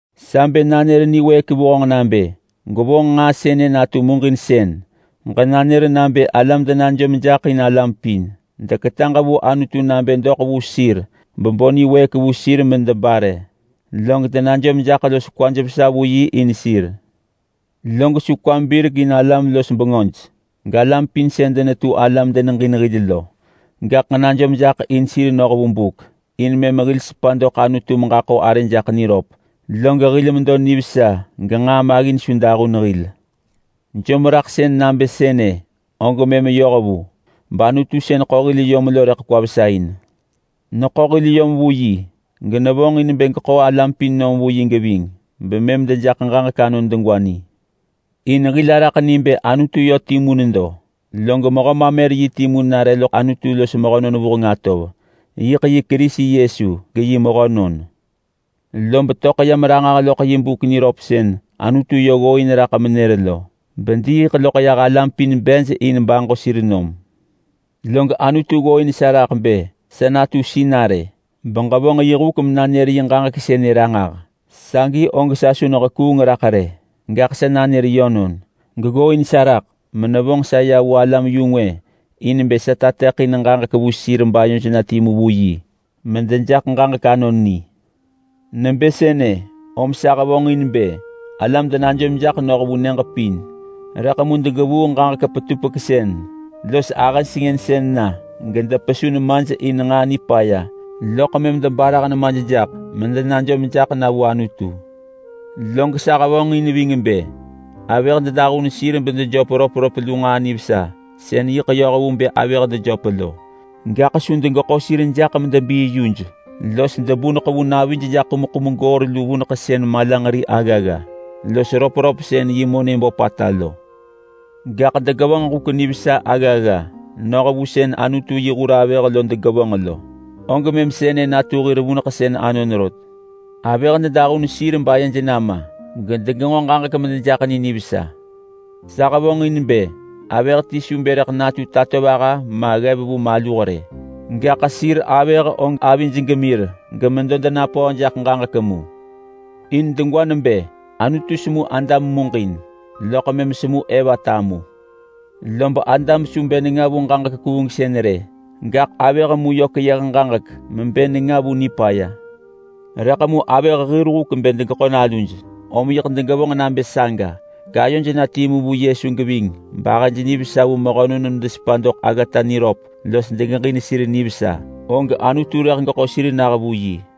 Sa bë nanër niwëëk vu honġ nabë ham gwevonġ nġaa sënë natu muġinsën: Ham najom jaḳ in alam pin. Ham kwetaġ vu Anutu nabë doḳ vu sir bebo niwëëk vu sir medebare, log ham najom jaḳ los kwamin vesa vu yi in sir. Log su kwam birek in alam-los-bengöj galam pin sën denetu ala medeneġin hil lo. Gaḳ ġenajom jaḳ in sir noh vu buk in mëm hil sepa doḳ Anutu meġaḳo arë jaḳ niröp, log hil medo nivesa genġaa maggin su dahun hil. Jomraḳsën nabë sënë og mëm yoh vu, bAnutu sën ḳo hil yom lo rëḳ kwa vesa in. Neḳo hil yom vu yi, genevonġ in bë geḳo alam pin nom geving, bemëm dejaḳ ġaġek anon degwa ni. In hil araḳ ni bë Anutu yö timu nedo, log Mehö mamer-yi timu nare loḳ Anutu los mehönon vuheng atov. Yiḳ yi Kerisi Yesu, geyi mehönon. Lob töḳ yam ranġah loḳ yi buk niröp sën Anutu yö ggooin raḳ menër lo, bediiḳ loḳ yah alam pin bej in baġo sir nom. Log Anutu ggooin sa raḳ bë sa natu sinarë beġevonġ yi huk menanër yi ġaġek sënë ranġah. Sagi og sa su nehekuung raḳ rë, gaḳ sa nanër yönon. Geggooin sa raḳ, menevonġ sa ya vu alam-yu-ngwë in bë sa tateḳin ġaġek vu sir bayoj na timu vu yi medejaḳ ġaġek anon ni. Nebë sënë, om sa hevonġin bë alam denajom jaḳ noh vu nyëġ pin. Rëḳ mu degevuu ġaġek petupeksën los ahë sengënsën na gedepesu nemaj in nġaa nipaya loḳ mëm debarah nemaj jaḳ medenajom jaḳ na vu Anutu. Log sa hevonġin ving bë: Avëh dedahun sir bedejöp röpröp lu nġaa nivesa sën yiḳ yoh vu bë avëh dejöp lo. Gaḳ su degeḳo sir jaḳ medebii yuj los debuneḳ vu navij jaḳ ḳumḳum goor lu vuneḳsën malanġeri aggagga, los röpröp sën yi monë böpata lo. Gaḳ degevonġ huk nivesa aggagga noh vu sën Anutu yi hur avëh lo degevonġ lo, og mëm sënë natu hir vuneḳsën anon rot. Avëh dedahun sir bayej nama gedegenġo ġaġek medejaḳ ni nivesa. Sa hevonġin bë avëh ti su natu tatovaha ma ggev vu maluh rë, gaḳ sir avëh og avij gemir gemedo denapöö jaḳ ġaġek mu. In degwa nebë Anutu semu Adam muġin loḳ mëm semu Eva tamusën. Lob Adam su bë nenga vu ġaġek kuungsën rë, gaḳ avëh mu yö keyëh mebë nenga vu ġaġek. Rëḳ mu avëh hir huk bë degeḳo naluj, om yiḳ degevonġ nabë saga, gayoj na timu vu Yesu geving bahëj nivesa vu mehönon medesepa doḳ aggata niröp los degeġin sir nivesa, og Anutu rëḳ geḳo sir nah vu yi.